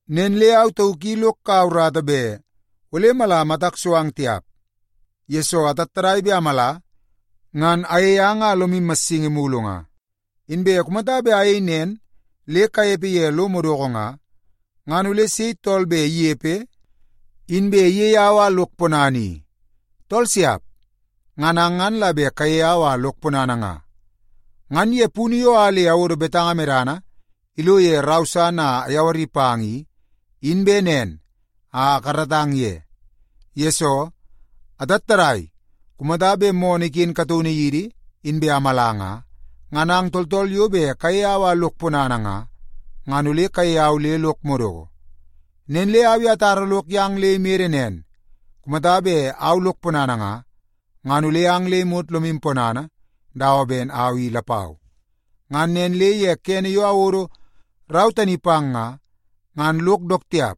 Nen le au tauk i lok kaua urata bet ole mala matak so ang tiap, yesoo atattadai bet amala, ngan ayei ang a lomu massingi mulu nga. Inbe kumata bet ayei nen le kanepe ye lo madoko nga, ngan ole sei tool bet inepe inbe iyei au a lok ponana i? Tool siap! Ngan ang ngan la bet kayei au a lok ponana nga. Ngan ye punu yo a le awodo betanga medana ilo ye rau san a ayawari pang i, in bet nen a akaratang ye. Yesoo, atattadai kumata bet moonoo iken kataunu yidi inbe amala nga, ngan ang tooltool yo bet kayei au a lok ponana nga, ngan ole kayei au le lok madoko. Nen le au i atara lok yang le imede nen, kumata bet au lok ponana nga, ngan ole ang le imot lomu ponana dawa ben au i lapau. Ngan nen le ye kene yo awodo rau tani pang nga, ngan lok dook tiap,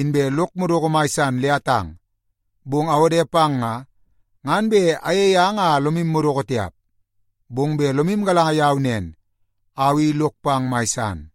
inbe lok madoko mai san le atang. Bong awode pang nga, ngan bet ayei ang a lomu madoko tiap, bong bet lomu galanga yau nen, au i lok pang mai san.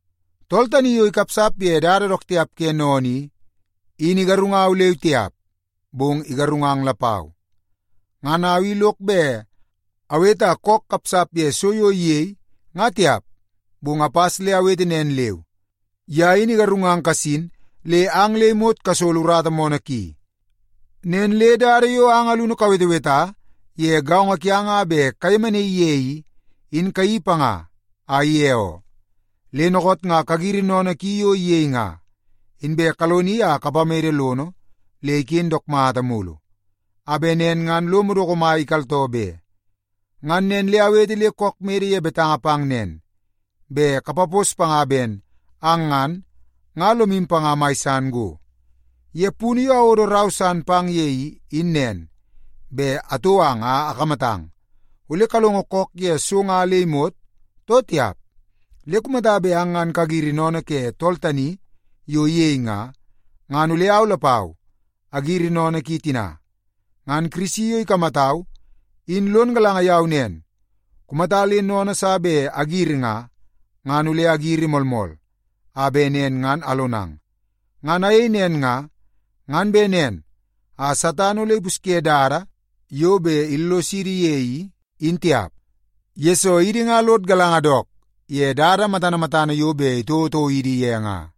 Tool tani yo ikapsap ye dada dook tiap ke sennene i, in igarungau leu tiap, bong igarungang lapau. Ngan au i lok bet awete a kook kapsap ye so yo iyei nga tiap, bong apas le awete nen leu, ye in igarungang kasin le ang le imot kasolo urata moonoo ki. Nen le dada yo ang alunu kaweteweta ye gaongo kiang a bet kayemenaii ye i, in kayeii panga a ige oo. Le dookoot nga kagiri sennene ki yo iyei nga, inbe kaloni a kapamede lono le iken dook mata mulu, a bet nen ngan lo madoko mai ikaltoo be. Ngan nen le awete le kook mede ye betanga pang nen, bet kapapos panga ben ang ngan, nga lomu panga mai san go. Ye punu yo awodo rau san pang ye i, in nen, bet atou ang a akamatang, ole kalongo kook ye so nga le imot, too tiap. Le kumata bet ang ngan kagiri sennene ke tool tani yo iyei nga, ngan ole au lapau agiri sennene ki tina. Ngan Kirisi yo ikamatau, in lon galanga yau nen, kumata le sennene sa bet agiri nga, ngan ole agiri moolmool, a bet nen ngan alonang. Ngan ayei nen nga, ngan bet nen a Satan ole ipusye dada yo bet illosidi ye i, in tiap, yesoo idi nga lod galanga dook ye dada matana matana yo bet itouotouo idi ye nga.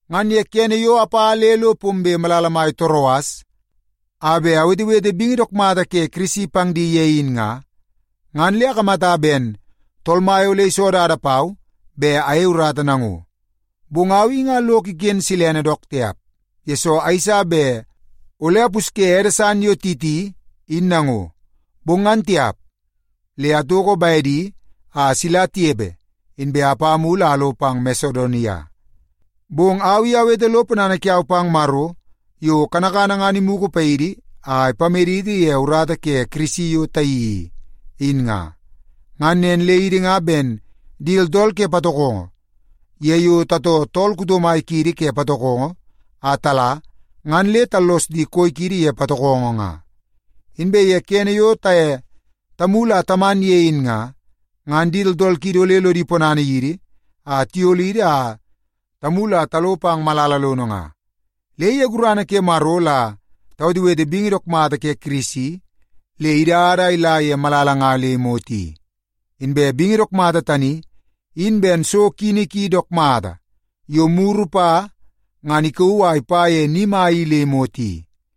Ngan ye kene yo apa le lo pombe malala mai Toroas a bet awetewete bingi dook mata ke Kirisi pang di ye in nga, ngan le akamata ben Tool Mai ole iso dada pau bet ayei urata nango. Bong au i nga lok iken silene dook tiap, yesoo ayeisa bet ole apusye ede san yo Titi in nango. Bong ngan tiap, le atoko bedi a sila tinepe, inbe apa mulu a alo pang Masedonia. Bong au i awete lo ponana kiau pang Maro yo kanakana ngan imugu paidi a ipamedidi ye urata ke Kirisi yo tayeii i. Ngan nen le idi nga ben di tooltool ke patokongo ye yo tatoo tool kuto mai kiidi ke patokongo a tala, ngan le tallos di koi kiidi ye patokongo nga. Inbe ye kene yo taye tamulu a taman ye in nga, ngan di tooltool kiidi ole lodi ponana yidi a tiyolidi a tamulu a talo pang malala lono nga. Le ye gurana ke Maro la tawetewete bingi dook mata ke Kirisi le idada a ila ye malala nga le imot i. Inbe bingi dook mata tani in ben so kini ki dook mata yo muru pa ngan ikauu a ipa ye ni mai i le imot i.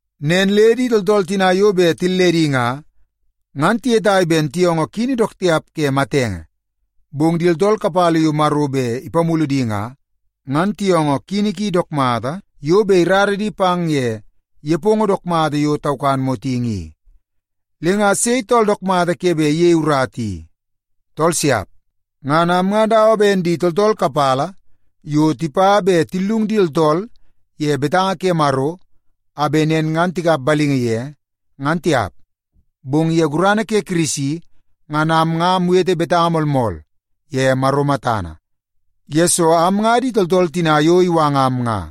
Nen le di tooltool tina yo bet tilledi nga, ngan tiyetai ben tiyoongoo kini dook tiap ke matenge. Bong di tooltool kapala yo Maro bet ipamulu di nga, ngan tiyoongoo kini ki dook mata yo bet irara di pang ye nepongo dook mata yo taukan motingi i. Le nga sei tool dook mata ke bet iyei urata i? Tool siap! Ngan am nga dawa ben di tooltool kapala yo tipa bet tillung di tooltool ye betanga ke Maro, a bet nen ngan tikap balingi ye, ngan tiap. Bong ye gurana ke Kirisi ngan am nga awete betanga moolmool ye Maro matana, yesoo am nga di tooltool tina yo iwangam nga.